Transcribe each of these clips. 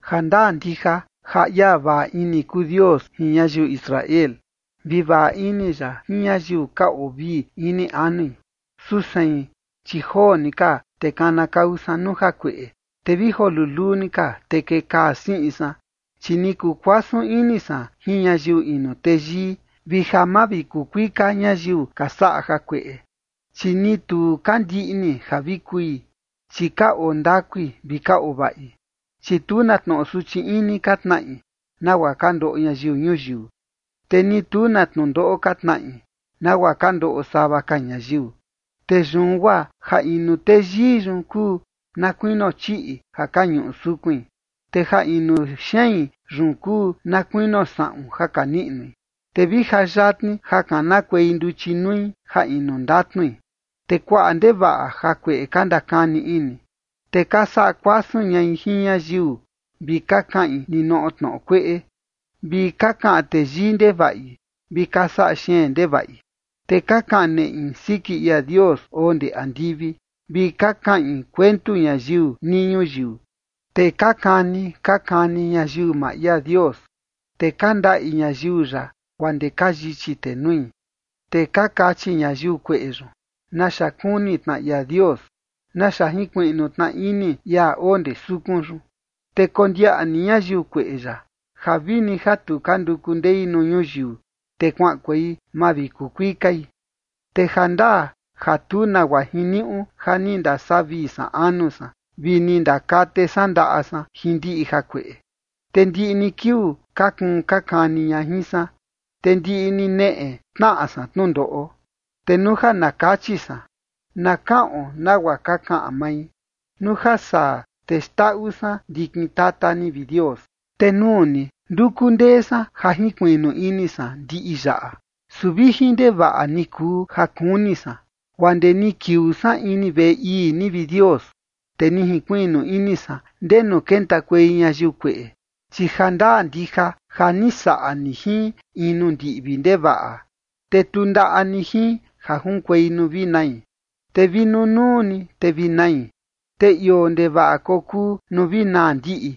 Jandaa ndija ja ia vaꞌa ini kuu Dios jin ñayiu Israel, vi vaꞌa ini ya jin ñayiu ka oo vii ini anui. Su sein, chi joo ni ka te kanakau san nuu jakueꞌe, te vi joo luluu ni ka, te kekaa siꞌin san. Chi ni kuu kuasun ini san jin ñayiu inu teyii, vi ja mavikukuika ñayiu ka saꞌa jakueꞌe. Chi ni tu ka ndiꞌni ja vi kui, chi ka oo ndakui vi ka oo vaꞌi. Chi tu na tnoꞌo suchi ini ka tnaꞌi nagua ka ndoꞌo ñayiu ñuyiu, te ni tu na tnundoꞌo ka tnaꞌi nagua ka ndoꞌo sava ka ñayiu. Te yun guaa ja inu teyii yun kuu na kuinio chiꞌi ja ka ñuꞌu sukuin, te ja inu xein yun kuu na kuinio saꞌun ja ka niꞌnui. Te vi ja yatni ja kanakuei nduchi nui ja inu ndatnui, te kuaꞌa ndevaꞌa jakueꞌe ka ndakani ini. Te ka saꞌa kuasun ñai jin ñayiu vi ka kaꞌin ninoꞌo tnoꞌo kueꞌe, vi ka kaꞌan teyii ndevaꞌi vi ka saꞌa xeen ndevaꞌi. Te ka kaꞌan neꞌi siki ia Dios oo ndee andivi, vi ka kaꞌin kuentu ñayiu nii ñuyiu. Te ka kani ka kani ñayiu maa ia Dios, te ka ndaꞌi ñayiu ya guaa ndee ka yichi tenui. Te ka kachi ñayiu kueꞌe yun: “¿Naxa kuni tna ia Dios? ¿Naxa jinkuiꞌnu tna ini ia oo ndee sukun yun?” Te kondiaꞌa ni ñayiu kueꞌe yaꞌa, ja vini ja tu ka nduku ndei nuu ñuyiu, te kuaꞌankuei mavikukuikai. Te jandaa ja tu nagua jiniuꞌu ja ni ndasavii san anu san, vi ni ndakate san ndaꞌa san jin ndiꞌi jakueꞌe. Te ndiꞌi ni kiuu ka kuun ka kani ña jin san, te ndiꞌi ni neꞌe tnaꞌa san tnundoꞌo. Te nuu ja na kachi san: “Na kaꞌon nagua ka kaꞌan mai”, nuu ja saa te xndaꞌu san ndikin tata ni, vi Dios. Te nuu ni, nduku ndee san ja jinkuiꞌnu ini san ndiꞌi yaꞌa, su vijin ndevaꞌa ni kuu ja kuni san. Guaa ndee ni kiuu san ini veꞌe ii ni, vi Dios, te ni jinkuiꞌnu ini san ndenu kentakuei ñayiu kueꞌe. Chi ja ndaa ndija ja ni saꞌa ni jin in nuu ndiꞌvi ndevaꞌa te tundaꞌa ni jin ja junkuei nuu vi nai. Te vi nunuu ni te vi nai, te ioo ndevaꞌa kokuu nuu vi naa ndiꞌi.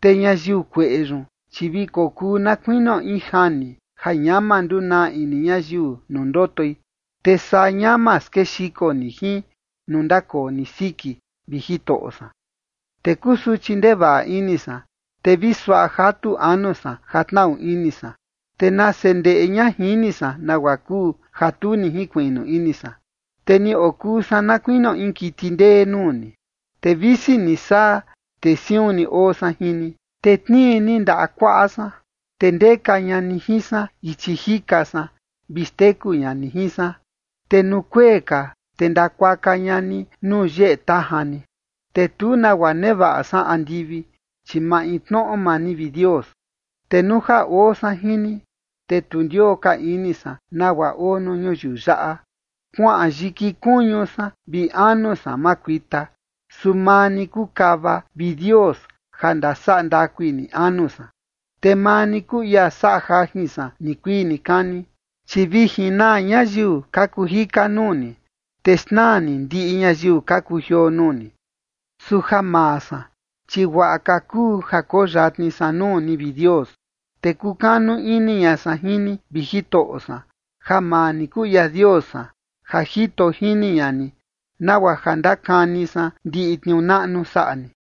Te ñayiu kueꞌe yun, chi vi kokuu na kuinio in jani ja ñama ndunaa ini ñayiu nuu ndotoi, te saa ñama skexiko ni jin nuu ndakoo ni siki, vi Jitoꞌo san. Te kusuchi ndevaꞌa ini san, te vi suaꞌa jatu anu san ja tnaꞌu ini san. Te nase ndeꞌe ña jini san nagua kuu, ja tu ni jinkuiꞌnu ini san, te ni okuu san na kuinio in kiti ndee nuu ni. Te visi ni saa, te siun ni oo san jin ni, te tnii ni ndaꞌa kuaꞌa san. Te ndeka ña ni jin san ichi jika san vi xteku ña ni jin san, te nuu kuee ka, te ndakuaka ña ni nuu yeꞌe tajan ni. Te tu nagua nevaꞌa san andivi, chi maintnoꞌo maa ni, vi Dios. Te nuu ja oo san jin ni, te tu ndioo ka ini san nagua oo nuu ñuyiu yaꞌa. Kuaꞌan yiki kuñu san vi anu san makuita, su maa ni kuu kava, vi Dios, ja ndasaꞌa ndakui ni anu san, te maa ni kuu ia saꞌa jajin san nikuii nikani. Chi vi jinaa ñayiu ka kuu jika nuu ni, te xnaa ni ndiꞌi ñayiu ka kujioo nuu ni. Su ja maa san, chi guaꞌa ka kuu ja koo yatni san nuu ni, vi Dios, te kukanu ini ña san jin ni, vi Jitoꞌo san, ja maa ni kuu ia Dios san, ja jito jini ña ni, nagua ja ndakani san ndiꞌi tniuu naꞌnu saꞌa ni.